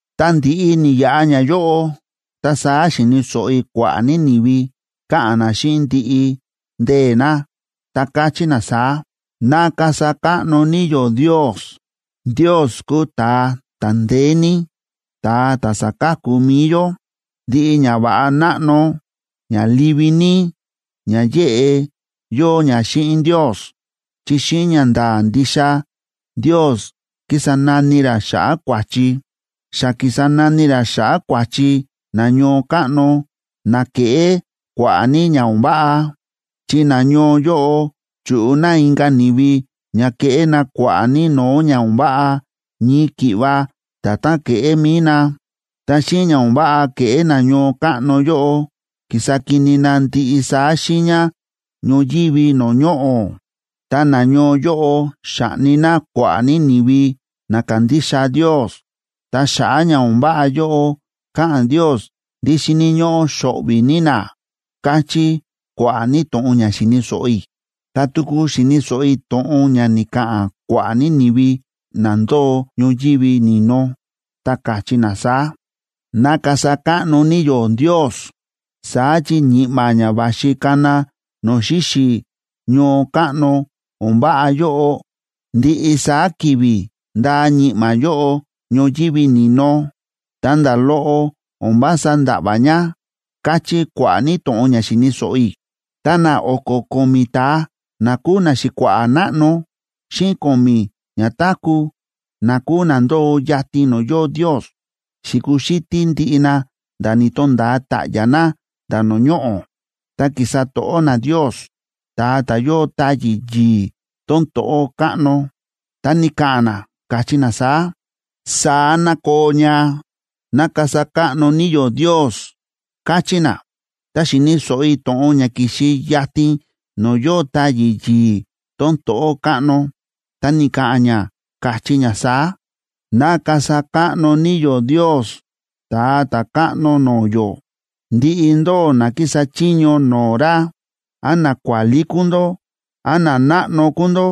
Ta ndi̱ꞌi ni̱yaꞌa ñayóꞌo, ta saá xi̱ni̱ so̱ꞌo i̱ kua̱ꞌa̱ ní ni̱vi, káꞌa̱n na xíꞌin ndiꞌi ndee̱ na, ta káchí na saá: ¡Ná kasa káꞌno ní yó Ndios!a ¡Ndios kúu ta̱a ta̱ ndeé ní, ta̱a ta̱ sa̱ka̱ku mi̱i yó! Ndiꞌi ñava̱ꞌa náꞌno ña livi ní ña yéꞌe yóo ña xíꞌin Ndios. Chi xíꞌin ñanda̱a̱ ndixa Ndios kísa nani ra xa̱ꞌa̱ kua̱chi. Xa ki̱sa nani ra xa̱ꞌa̱ kua̱chi na ñoo káꞌno na kéꞌé kua̱ꞌa̱ ní ña o̱n váꞌa. Chi nañoo yóꞌo chu̱ꞌu na inka̱ ni̱vi ña ke̱ꞌé na kua̱ꞌa̱ ní no̱o̱ ña o̱n váꞌa ñii ki̱ꞌva nda̱tán ke̱ꞌé mi̱i na, ta xíꞌin ña o̱n váꞌa ke̱ꞌé na ñoo káꞌno yóꞌo, ki̱sa kini na ndiꞌi saá xiiña ñoyívi no̱o̱ ñoꞌo̱. Ta nañoo yóꞌo xa̱ꞌni na kua̱ꞌa̱ ní ni̱vi na kándixa Ndios. Ta xa̱ꞌa̱ ña o̱n váꞌa yóꞌo, káꞌa̱n Ndios ndí xíni̱ ñóꞌó xo̱ꞌvi̱ ní na, káchí kua̱ꞌa̱ ní to̱ꞌon ña xi̱ni̱ so̱ꞌo i̱. Ta tuku xi̱ni̱ so̱ꞌo i̱ to̱ꞌon ña ni̱ka̱ꞌa̱n kua̱ꞌa̱ ní ni̱vi na ndóo ñoyívi ni̱no, ta káchí na saá: ¡Ná kasa káꞌno ní yó Ndios! Saá chi ñi̱ꞌma̱ ña va̱xi kana no̱o̱ xíxi̱ ñoo káꞌno o̱n váꞌa yóꞌo, ndiꞌi saá ki̱vi̱ ndáa ñi̱ꞌma̱ yóꞌo ñoyívi ni̱no, ta nda̱ loꞌo o̱n vása nda̱ꞌva̱ ña, káchí kua̱ꞌa̱ ní to̱ꞌon ña xi̱ni̱ so̱ꞌo i̱. Ta na o̱ko̱ ko̱mi̱ ta̱a na kúu naxi̱kua̱ꞌa̱ náꞌno, xíꞌin ko̱mi̱ ñatáku̱, na kúu na ndóo yatin no̱o̱ yóo Ndios, xi̱kuxítí ndiꞌi na nda̱ ni̱to̱nda̱a ta̱ꞌya̱ na nda̱ no̱o̱ ñoꞌo̱, ta ki̱sa to̱ꞌó na Ndios, ta̱a ta̱ yóo táyi̱ yi̱i̱ tón to̱ꞌó káꞌno. Ta ni̱ka̱ꞌa̱n na, káchí na saá: ―¡Saá ná koo ña! ¡Ná kasa káꞌno ní yó Ndios! ―káchí na. Ta xi̱ni̱ so̱ꞌo i̱ to̱ꞌon ña ki̱xi yatin no̱o̱ yóo táyi̱ yi̱i̱ tón to̱ꞌó káꞌno, ta ni̱ka̱ꞌa̱n ña, káchí ña saá: ¡Ná kasa káꞌno ní yó Ndios, Ta̱a Ta̱káꞌno no̱o̱ yó! ¡Ndiꞌi ndóꞌó na kísa chiño no̱o̱ ra, án nakuálí kúu ndó, án nanáꞌno kúu ndó,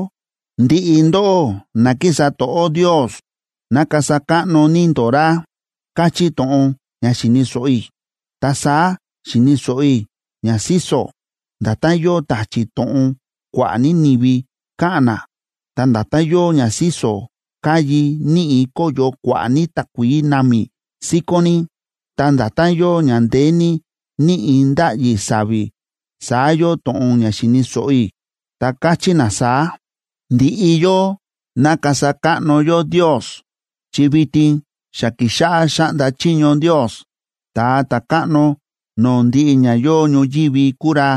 ndiꞌi ndóꞌó na kísa to̱ꞌó Ndios, ná kasa káꞌno ní ndó ra! káchí to̱ꞌon ña xi̱ni̱ so̱ꞌo i̱. Ta saá xi̱ni̱ so̱ꞌo i̱ ña síso̱, nda̱tán yóo ta̱chi̱ to̱ꞌon kua̱ꞌa̱ ní ni̱vi káꞌa̱n na, ta nda̱tán yóo ña síso̱ káyi níꞌi̱ kóyo kua̱ꞌa̱ ní takuií námi síkón ní, ta nda̱tán yóo ña ndeé ní níꞌi̱ ndáꞌyi sa̱vi̱, saá yóo to̱ꞌon ña xi̱ni̱ so̱ꞌo i̱, ta káchí na saá: ¡Ndiꞌi yó, ná kasa káꞌno yó Ndios! ¡Chi vitin xa ki̱xáꞌá xáꞌnda chiño Ndios, ta̱a ta̱káꞌno no̱o̱ ndiꞌi ña yóo ñoyívi kúu ra,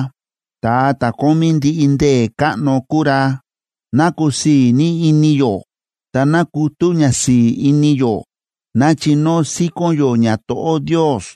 ta̱a ta̱ kómí ndiꞌi ndee̱ káꞌno kúu ra! ¡Ná kusii̱ ní ini yó, ta ná kutú ñasi̱i̱ ini yó! ¡Ná chinóo síkón yó ñato̱ꞌó Ndios!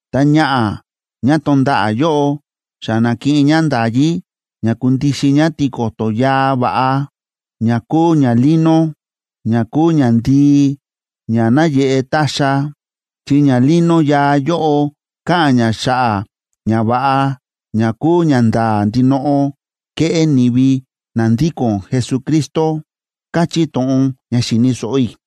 Ta ñaꞌa̱ ñá tonda̱ꞌa̱ yóꞌo xa na̱kiꞌin ñá nda̱yí ña kundixin ñá tiko̱to̱ yaa va̱ꞌa, ña kúu ñalino, ña kúu ñandii ña náyeꞌe táxa, (chi ñalino yaa yóꞌo káꞌa̱n ña xa̱ꞌa̱ ñava̱ꞌa ña kúu ñanda̱a̱ ndinoꞌo ke̱ꞌé ni̱vi na ndíko̱n Jesucristo), káchí to̱ꞌon ña xi̱ni̱ so̱ꞌo i̱.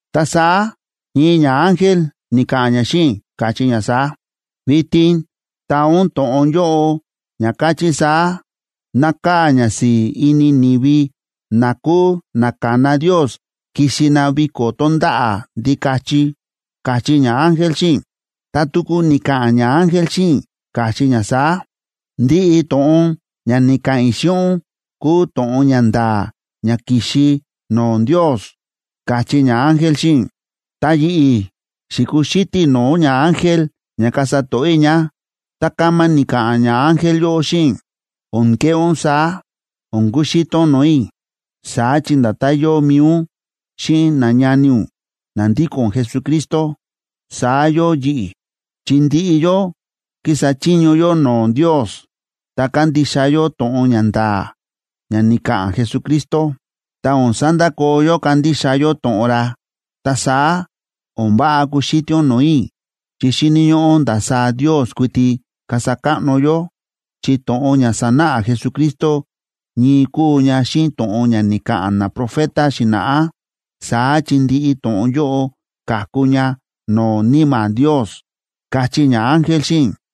Ta saá ñii ñaángel ni̱ka̱ꞌa̱n ña xíꞌin i̱, káchí ña saá: ―Vitin taa ún to̱ꞌon yóꞌo, ña káchí saá: “Nákaa̱ ñasi̱i̱ ini ni̱vi na kúu na ka̱na Ndios kixi na viko̱ tonda̱ꞌa̱ Ndikachi” ―káchí ñaángel xíꞌin i̱. Ta tuku ni̱ka̱ꞌa̱n ñaángel xíꞌin i̱, káchí ña saá: ―Ndiꞌi to̱ꞌon ña ni̱ka̱ꞌa̱n i̱ xíꞌin ún kúu to̱ꞌon ña nda̱a̱ ña ki̱xi no̱o̱ Ndios ―káchí ñaángel xíꞌin i̱. Ta yi̱ꞌi̱ xi̱kuxítí i̱ no̱o̱ ñaángel ña kasa to̱ꞌó i̱ ña, ta kama ni̱ka̱ꞌa̱n ñaángel yóꞌo xíꞌin i̱: ―O̱n keꞌé ún saá, o̱n kuxítí ún no̱o̱ i̱. Saá chi nda̱tán yóo mi̱i ún xíꞌin nañani ún na ndíko̱n Jesucristo, saá yóo yi̱ꞌi̱, chi ndiꞌi yó kísa chiño yó no̱o̱ Ndios, ta kándixa yó to̱ꞌon ña nda̱a̱ ña ni̱ka̱ꞌa̱n Jesucristo, ta o̱n sandakoo yó kándixa yó to̱ꞌon ra. Ta saá o̱n váꞌa kuxítí ún no̱o̱ i̱, chi xíni̱ ñóꞌó ndasaá Ndios kuiti kasa káꞌno yó. Chi to̱ꞌon ña sa̱náꞌa Jesucristo ñii kúu ña xíꞌin to̱ꞌon ña ni̱ka̱ꞌa̱n naprofeta xi̱na̱ꞌá, saá chi ndiꞌi to̱ꞌon yóꞌo ka̱ku ña no̱o̱ Níma̱ Ndios ―káchí ñaángel xíꞌin i̱.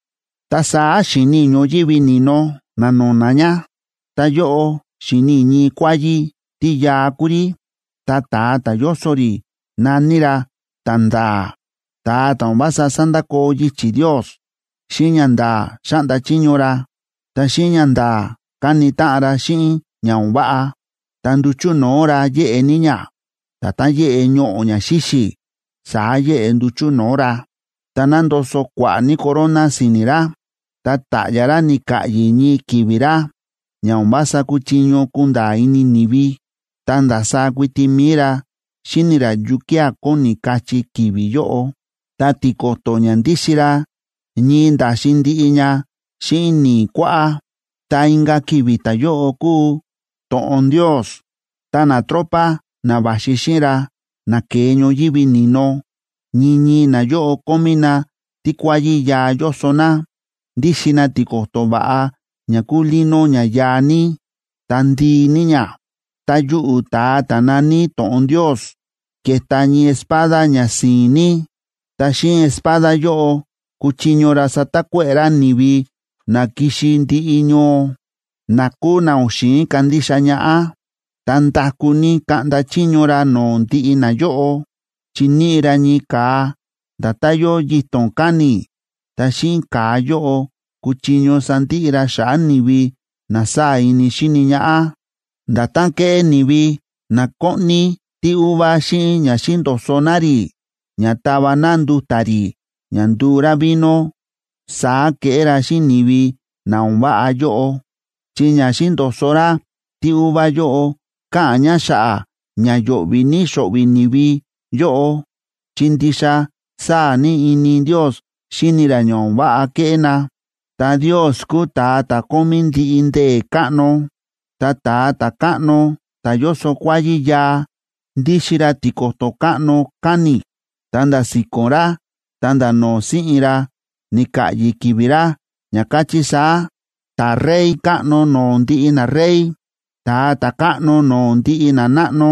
Ta saá xi̱ni i̱ ñoyívi ni̱no na̱no̱na̱ ña, ta yóꞌo xi̱ni i̱ ñii kuáyí, tí yaa kúu rí. Ta ta̱a ta̱ yóso rí na̱ní ra Ta̱nda̱a̱, ta̱a ta̱ o̱n vása sándakoo yichi̱ Ndios. Xíꞌin ñanda̱a̱ xáꞌnda chiño ra, ta xíꞌin ñanda̱a̱ káni táꞌan ra xíꞌin ña o̱n váꞌa. Ta nduchu̱ no̱o̱ ra yéꞌe ní ña, nda̱tán yéꞌe ñoꞌo̱ ña xíxi̱, saá yéꞌe nduchu̱ no̱o̱ ra. Ta nándoso kua̱ꞌa̱ ní corona si̱ni̱ ra. Ta ta̱ꞌya̱ ra ni̱ka̱ꞌyi̱ ñii ki̱vi̱ ra ña o̱n vása kúchiño kunda̱a̱ ini ni̱vi, ta ndasaá kuiti mi̱i ra xíni̱ ra yukía̱ kóni kachí ki̱vi̱ yóꞌo. Ta tiko̱to̱ ña ndíxin ra ñii nda̱xin ndiꞌi ña xíꞌin ni̱i̱ kuáꞌá. Ta inka̱ ki̱vi̱ ta̱yóꞌo kúu “To̱ꞌon Ndios.” Ta natropa na va̱xi xíꞌin ra, na ke̱e ñoyívi ni̱no, ñii ñii nayóꞌo kómí na tíkuáyí yaa yóso na. Ndíxin na tiko̱to̱ va̱ꞌa ña kúu lino ña yaa ní, ta ndii ní ña. Ta yuꞌu̱ ta̱a ta̱ na̱ní To̱ꞌon Ndios ke̱ta ñii espada ña si̱i̱n ní, ta xíꞌin espada yóꞌo kuchiño ra satakuéꞌe̱ ra ni̱vi na ki̱xi ndiꞌi ñoo, na kúu na o̱n xi̱in kandixa ñaꞌá. Ta nda̱kú ní kaꞌnda chiño ra no̱o̱ ndiꞌi nayóꞌo, chi níꞌi ra ñii ka̱a nda̱tán yóo yito̱n káni̱, ta xíꞌin ka̱a yóꞌo kuchiño sandiꞌi ra xa̱ꞌa̱ ni̱vi na sáa̱ ini xíni ñaꞌá. Nda̱tán kéꞌé ni̱vi na kóꞌni tíuva xíꞌin ña xíndo̱so̱ na rí ña táva na nduta̱ rí ña nduu rá vino, saá keꞌé ra xíꞌin ni̱vi na o̱n váꞌa yóꞌo. Chi ña xíndo̱so̱ ra tíuva yóꞌo káꞌa̱n ña xa̱ꞌa̱ ña yo̱ꞌvi̱ ní xo̱ꞌvi̱ ni̱vi yóꞌo chi ndixa sáa̱ ní ini Ndios xíni ra ña o̱n váꞌa ke̱ꞌé na, ta Ndios kúu ta̱a ta̱ kómí ndiꞌi ndee̱ káꞌno. Ta ta̱a ta̱káꞌno ta̱ yóso kuáyí yaa, ndíxin ra tiko̱to̱ káꞌno káni̱, ta nda̱ si̱ko̱n ra ta̱nda̱ no̱o̱ si̱ꞌin ra ni̱ka̱ꞌyi̱ ki̱vi̱ ra, ña káchí saá: “Ta̱Rey káꞌno no̱o̱ ndiꞌi narey. Ta̱a Ta̱káꞌno no̱o̱ ndiꞌi nanáꞌno”,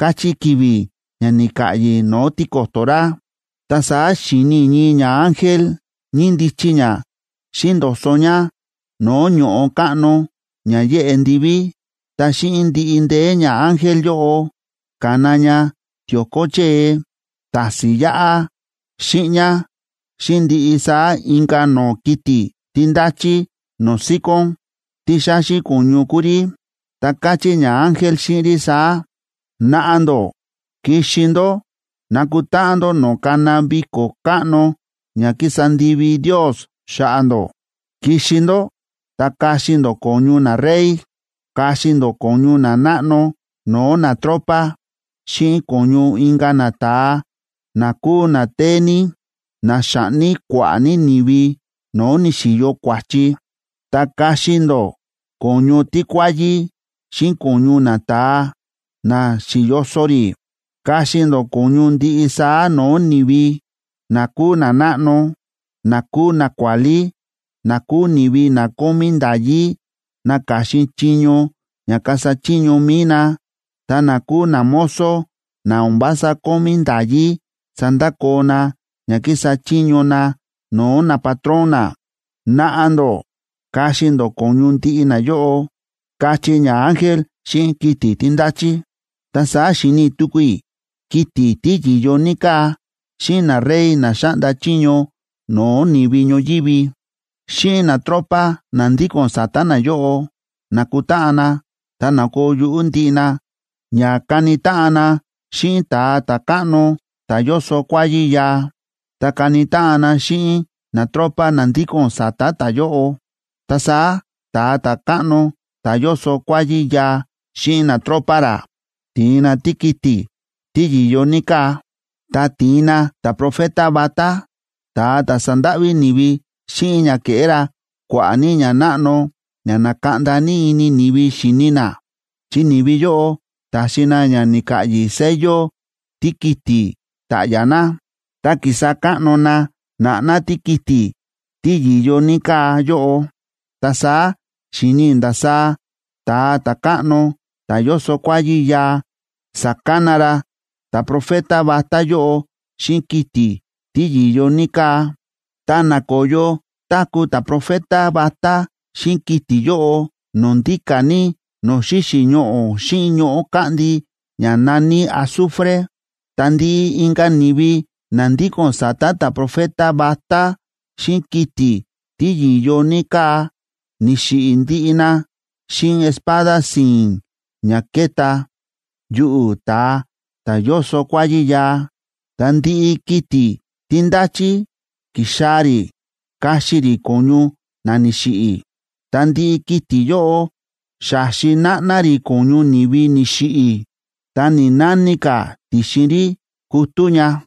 káchí ki̱vi̱ ña ni̱ka̱ꞌyi̱ no̱o̱ tiko̱to̱ ra. Ta saá xi̱ni i̱ ñii ñaángel ñíndichi ña xíndo̱so̱ ña no̱o̱ ño̱ꞌo káꞌno ña yéꞌe ndiví, ta xíꞌin ndiꞌi ndee̱, ñaángel yóꞌo ka̱na ña tio̱ko chée, ta̱si̱n yáꞌá, xíꞌñá, xíꞌin ndiꞌi saá inka̱ no̱o̱ kiti̱ tí ndáchí no̱o̱ síkón, tí xáxi ko̱ñu kúu rí, ta káchí ñaángel xíꞌin rí saá: ―Naꞌa ndó, kixi ndó nakutáꞌan ndó no̱o̱ kána viko̱ káꞌno ña ki̱sa ndivi Ndios xa̱ꞌa̱ ndó. Kixi ndó ta kaxi ndó ko̱ñu narey, kaxi ndó ko̱ñu nanáꞌno no̱o̱ natropa xíꞌin ko̱ñu inka̱ nata̱a na kúu na téé ní, na xa̱ꞌni kua̱ꞌa̱ ní ni̱vi no̱o̱ ni̱xi̱yo kua̱chi. Ta kaxi ndó ko̱ñu tíkuáyí xíꞌin ko̱ñu nata̱a na xi̱yoso rí, kaxi ndó ko̱ñu ndiꞌi saá no̱o̱ ni̱vi, na kúu nanáꞌno, na kúu nakuálí, na kúu ni̱vi na kómí nda̱yí naka̱xin chiño ña kasa chiño mi̱i na, ta na kúu namozo na o̱n vása kómí nda̱yí sandakoo na ña kísa chiño na no̱o̱ napatrón na. Naꞌa ndó kaxi ndó ko̱ñu ndiꞌi nayóꞌo ―káchí ñaángel xíꞌin kiti̱ tí ndáchí. Ta saá xi̱ni tuku i̱ kiti̱ tí yi̱yo ní káa, xíꞌin narey na xáꞌnda chiño no̱o̱ ni̱vi ñoyívi, xíꞌin natropa na ndíko̱n sa̱ta̱ nayóꞌo, na̱kutáꞌan na ta na̱koo yuꞌú ndiꞌi na ña kani táꞌan na xíꞌin ta̱a ta̱káꞌno ta̱ yóso kuáyí yaa, ta kani táꞌan na xíꞌin natropa na ndíko̱n sa̱ta̱ ta̱yóꞌo. Ta saá ta̱a ta̱káꞌno ta̱ yóso kuáyí yaa xíꞌin natropa ra ti̱in na tíkiti̱ tí yi̱yo ní káa, ta ti̱in na ta̱profeta vatá, ta̱a ta̱ sa̱ndáꞌví ni̱vi xíꞌin ña ke̱ꞌé ra kua̱ꞌa̱ ní ñanáꞌno ña na̱kaꞌnda ní ini ni̱vi xi̱ni na. Chi ni̱vi yóꞌo ta̱xi na ña ni̱ka̱ꞌyi̱ sello tíkiti̱ ta̱ꞌya̱ na, ta ki̱sa káꞌno na na̱ꞌná tíkiti̱ tí yi̱yo ní káa yóꞌo. Ta saá xi̱ni i̱ ndasaá ta̱a ta̱káꞌno ta̱ yóso kuáyí yaa sa̱kana ra ta̱profeta vatá yóꞌo xíꞌin kiti̱ tí yi̱yo ní káa, ta na̱koyo táku̱ ta̱profeta vatá xíꞌin kiti̱ yóꞌo no̱o̱ ndíka̱ ní no̱o̱ xíxi̱ ñoꞌo̱ xíꞌin ñoꞌo̱ káꞌndi ña na̱ní azufre. Ta ndiꞌi inka̱ ni̱vi na ndíko̱n sa̱ta̱ ta̱profeta vatá xíꞌin kiti̱ tí yi̱yo ní káa, ni̱xiꞌi̱ ndiꞌi na xíꞌin espada si̱i̱n ña ke̱ta yuꞌu̱ ta̱a ta̱ yóso kuáyí yaa, ta ndiꞌi kiti̱ tí ndáchí ki̱xaa̱ rí kaxi rí ko̱ñu na ni̱xiꞌi̱. Ta ndiꞌi kiti̱ yóꞌo xa̱xi náꞌná rí ko̱ñu ni̱vi ni̱xiꞌi̱, nda̱ ni̱‑nani ka̱ ti̱xin rí kutú ña.